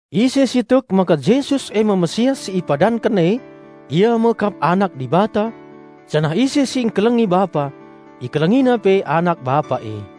Ise si tek maka Jesus e me Raja Penampat si padanken e, ia anak kap Dibata; janah ise si ngkelengi Bapa, ikelengina pe anak Bapa e.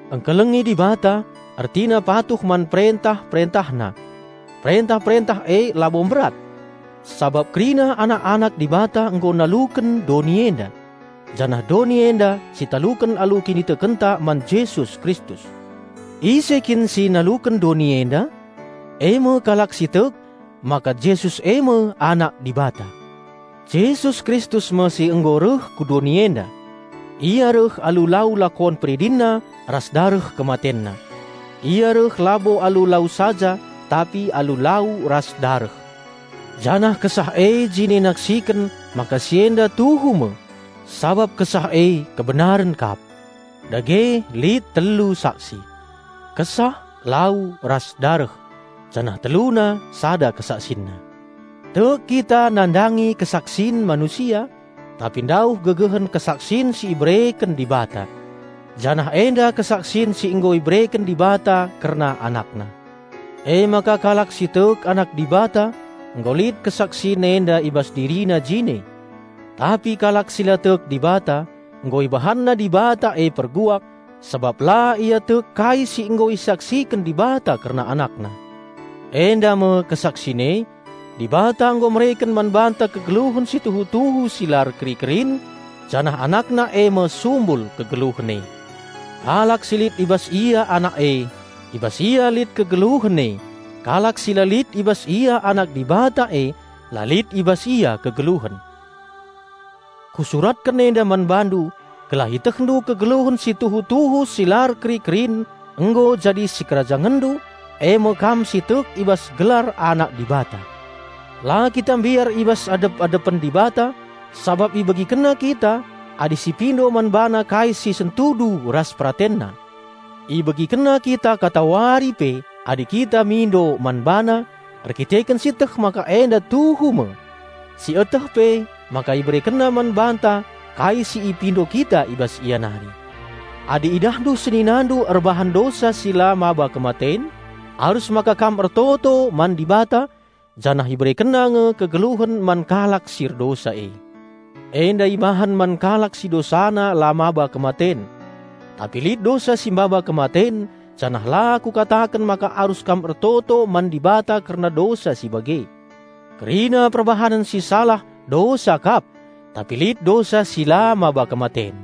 Ngkelengi Dibata ertina patuh man perentah-PerentahNa. Perentah-perentah e labo mberat, sabap kerina anak-anak Dibata nggo naluken doni enda. Janah doni enda sitaluken alu kinitekenta man Jesus Kristus. Ise kin si naluken doni enda? E me kalak si tek maka Jesus e me Anak Dibata. Jesus Kristus me si nggo reh ku doni enda. Ia reh alu lau lakon PeridinNa ras dareh KematenNa. Ia reh labo alu lau saja tapi alu lau ras dareh. Janah Kesah e jine naksiken maka si enda tuhu me, sabap Kesah e kebenaren kap. Dage lit telu saksi: Kesah, lau ras dareh; janah teluna sada kesaksinna. Tek kita nandangi kesaksin manusia; tapi ndauh gegehen kesaksin si ibereken Dibata. Janah enda kesaksin si nggo ibereken Dibata kerna AnakNa. Emaka kalak si tek Anak Dibata, nggo lit kesaksin enda i bas dirina jine. Tapi kalak si la tek Dibata, nggo ibahanna Dibata e perbual, sabap la ia tek kai si nggo isaksiken Dibata kerna AnakNa. Enda me kesaksin e: Dibata nggo mereken man banta kegeluhen si tuhu-tuhu si la erkeri-kerin, janah AnakNa e me sumbul kegeluhen e. Kalak si lit i bas ia Anak e, i bas ia lit kegeluhen e; kalak si la lit i bas ia Anak Dibata e, la lit i bas ia kegeluhen. Kusuratken enda man bandu gelah itehndu kegeluhen si tuhu-tuhu si la erkeri-kerin nggo jadi sikerajangenndu eme kam si tek i bas gelar Anak Dibata. La kita mbiar i bas adep-adepen Dibata sabap IbegikenNa kita adi sipindo man BaNa kai si sentudu ras PeratenNa. IbegikenNa kita katawari pe adi kita mindo man BaNa; erkiteken sieteh maka enda tuhu me, sieteh pe maka IberekenNa man banta kai si ipindo kita i bas Ia nari. Adi idahndu seninandu erbahan dosa si la maba kematen, arus maka kam ertoto man Dibata, janah IberekenNa nge kegeluhen man kalak si erdosa e. Enda ibahan man kalak si dosana la maba kematen. Tapi lit dosa si maba kematen, janah la kukataken maka arus kam ertoto man Dibata kerna dosa si bage. Kerina perbahanen si salah dosa kap, tapi lit dosa si la maba kematen.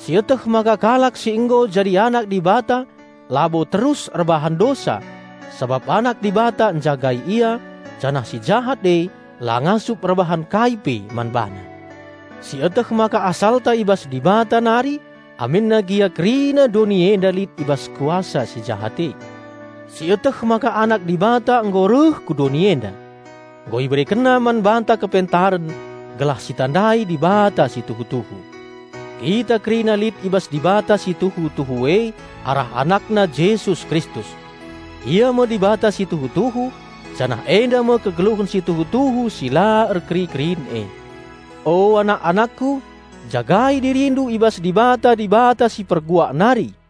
Sieteh maka kalak si nggo jadi anak Dibata labo terus erbahan dosa, sabap Anak Dibata njagai ia, janah si Jahat e la ngasup erbahan kai pe man bana. Sieteh maka asalta i bas Dibata nari aminna gia kerina doni enda lit i bas kuasa si Jahat e. Sieteh maka Anak Dibata nggo reh ku doni enda. Nggo IberekenNa man banta kepentaren gelah sitandai Dibata si tuhu-tuhu. Kita kerina lit i bas Dibata si tuhu-tuhu e arah AnakNa Jesus Kristus. Ia me Dibata si tuhu-tuhu, janah enda me kegeluhen si tuhu-tuhu si la erkeri-kerin e. O anak-anakku, jagai dirindu i bas dibata-dibata si perguak nari!